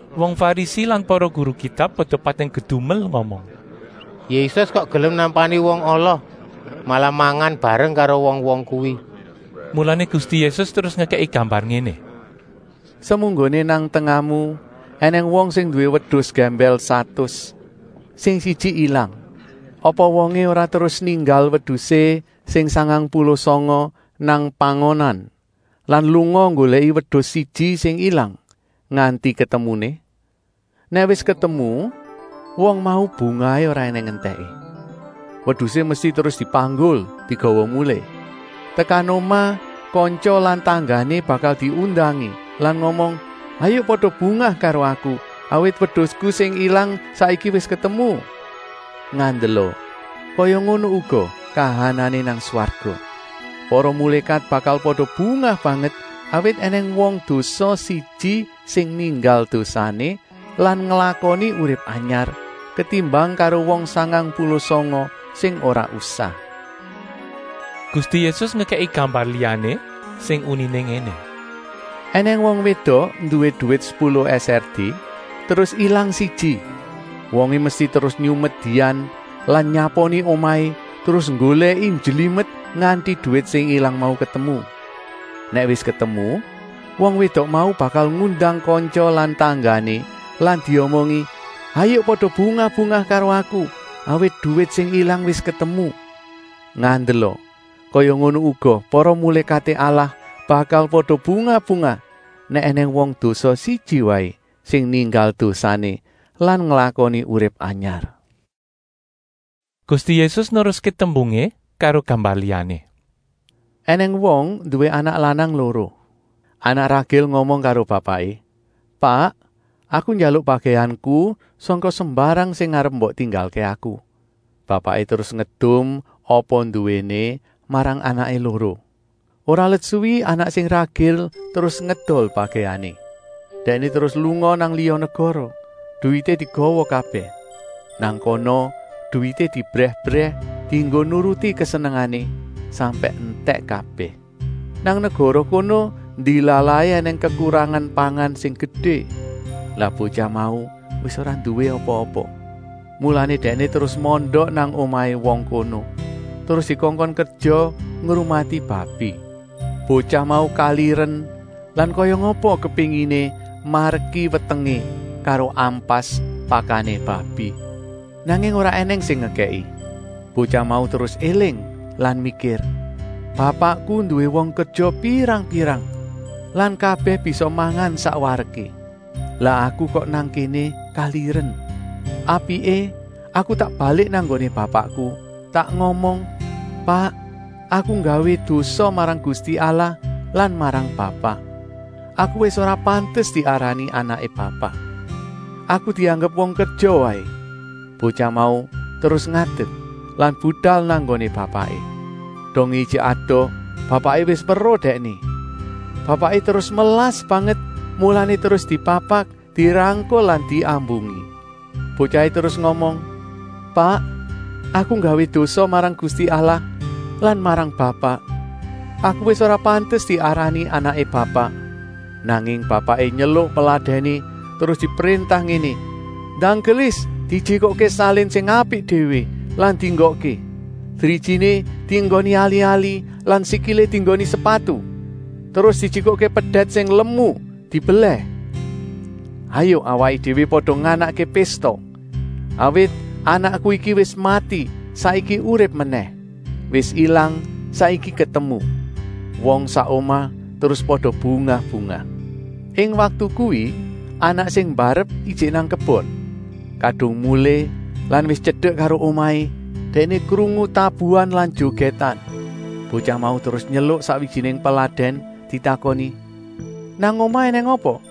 Wong Farisi lan para guru Kitab pada pating kedumel ngomong: “Yésus kok gelem nampani wong ala, malah mangan bareng karo wong-wong kuwi?” Mulané Gusti Yésus terus ngekèki gambar ngéné: “Semunggoné nang tengahmu ènèng wong sing nduwé wedus gèmbèl satus, sing siji ilang. Apa wongé ora terus ninggal wedusé sing sangang puluh sanga nang pangonan lan lunga nggolèki wedus siji sing ilang, nganti ketemuné? Nèk wis ketemu, wong mau bungahé ora ènèng entèké. Wedusé mesti terus dipanggul, digawa mulih. Tekan omah kantya lan tanggané bakal diundangi lan ngomong: ‘Hayuk pada bungah karo aku, awit wedusku sing ilang saiki wis ketemu.’ Ngandela, kaya ngono uga kahanané nang swarga. Para mulékat bakal pada bungah banget, awit ènèng wong dosa siji sing ninggal dosané lan nglakoni urip anyar, ketimbang karo wong sangang puluh sanga sing ora usah.” Gusti Yésus ngekèki gambar liyané sing uniné ngéné: “Enèng wong wédok nduwé duwit sepuluh pérak terus ilang siji. Wongé mesti terus nyumet dian lan nyaponi omahé, terus nggolèki njlimet, nganti duwit sing ilang mau ketemu. Nèk wis ketemu, wong wédok mau bakal ngundang kantya lan tanggané lan diomongi: ‘Hayuk pada bungah-bungah karo aku, awit duwit sing ilang wis ketemu.’ Ngandela, kaya ngono uga para mulékaté Allah bakal pada bungah-bungah, nèk ènèng wong dosa siji waé sing ninggal dosané lan nglakoni urip anyar.” Gusti Yésus neruské tembungé karo gambar liyané: “Enèng wong nduwé anak lanang loro. Anak ragil ngomong karo bapaké: ‘Pak, aku njaluk bagèanku sangka sembarang sing arep mbok tinggalké aku.’ Bapaké terus ngedum apa nduwéné marang anaké loro. Ora let suwi anak sing ragil terus ngedol bagèané. Dèkné terus lunga nang liya negara, duwité digawa kabèh. Nang kana duwité diebrèh-ebrèh dienggo nuruti kesenengané, sampèk entèk kabèh. Nang negara kono ndilalahé ènèng kekurangan pangan sing gedé. Lah botyah mau wis ora nduwé apa-apa. Mulané dèkné terus mondok nang omahé wong kono, terus dikongkon kerja ngrumati babi. Botyah mau kaliren lan kaya ngapa kepénginé mareki wetengé karo ampas pakané babi, nanging ora ènèng sing ngekèki. Botyah mau terus éling lan mikir: ‘Bapakku nduwé wong kerja pirang-pirang lan kabèh bisa mangan sak wareké. Lah aku kok nang kéné kaliren. Apiké aku tak balik nang nggoné bapakku, tak ngomong: Pak, aku nggawé dosa marang Gusti Allah lan marang Bapak. Aku wis ora pantes diarani anaké Bapak. Aku dianggep wong kerja waé.’ Botyah mau terus ngadek lan budal nang nggoné bapaké. “Dongé ijik adoh, bapaké wis weruh dèkné. Bapaké terus melas banget, mulané terus dipapak, dirangkul lan diambungi. Botyahé terus ngomong: ‘Pak, aku nggawé dosa marang Gusti Allah lan marang Bapak. Aku wis ora pantes diarani anaké Bapak.’ Nanging bapaké nyeluk peladèné terus dipréntah ngéné: ‘Ndang gelis dijikukké salin sing apik déwé lan dienggokké. Drijiné dienggoni ali-ali lan sikilé dienggoni sepatu. Terus dijikukké pedèt sing lemu dibelèh. Hayuk awaké déwé pada nganakké pésta. Awit anakku iki wis mati, saiki urip menèh; wis ilang, saiki ketemu!’ Wong sak omah terus pada bungah-bungah. “Ing waktu kuwi anak sing mbarep ijik nang kebon. Kadung mulih lan wis tyedek karo omahé, dèkné krungu tabuan lan jogètan. Botyah mau terus nyeluk sakwijiné peladèn ditakoni: ‘Nang omah ènèng apa?’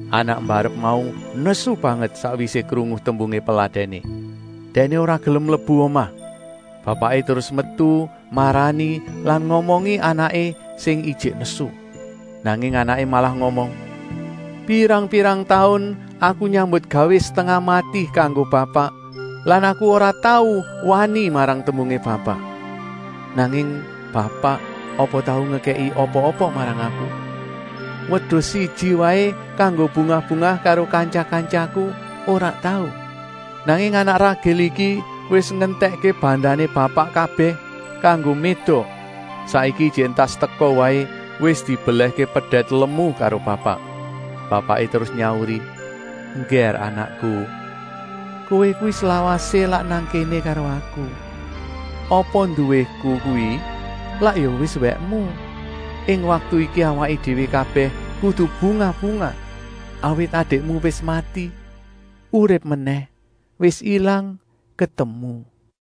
“Anak mbarep mau nesu banget sakwisé krungu tembungé peladèné. Dèkné ora gelem mlebu omah. Bapaké terus metu marani lan ngomongi anaké sing ijik nesu. Nanging anaké malah ngomong: ‘Pirang-pirang taun aku nyambutgawé setengah mati kanggo Bapak lan aku ora tau wani marang tembungé Bapak. Nanging Bapak apa tau ngekèki apa-apa marang aku. Wedus siji waé kanggo bungah-bungah karo kantya-kantyaku ora tau. Nanging anak ragil iki wis ngentèkké bandané Bapak kabèh kanggo médok, saiki ijik entas teka waé wis dibelèhké pedèt lemu karo Bapak.’ Bapaké terus nyauri: ‘Enggèr anakku, kowé kuwi slawasé lak nang kéné karo aku. Apa nduwéku kuwi lak ya wis wèkmu. Ing waktu iki awaké déwé kabèh kudu bungah-bungah, awit adikmu wis mati, urip menèh, wis ilang, ketemu!’”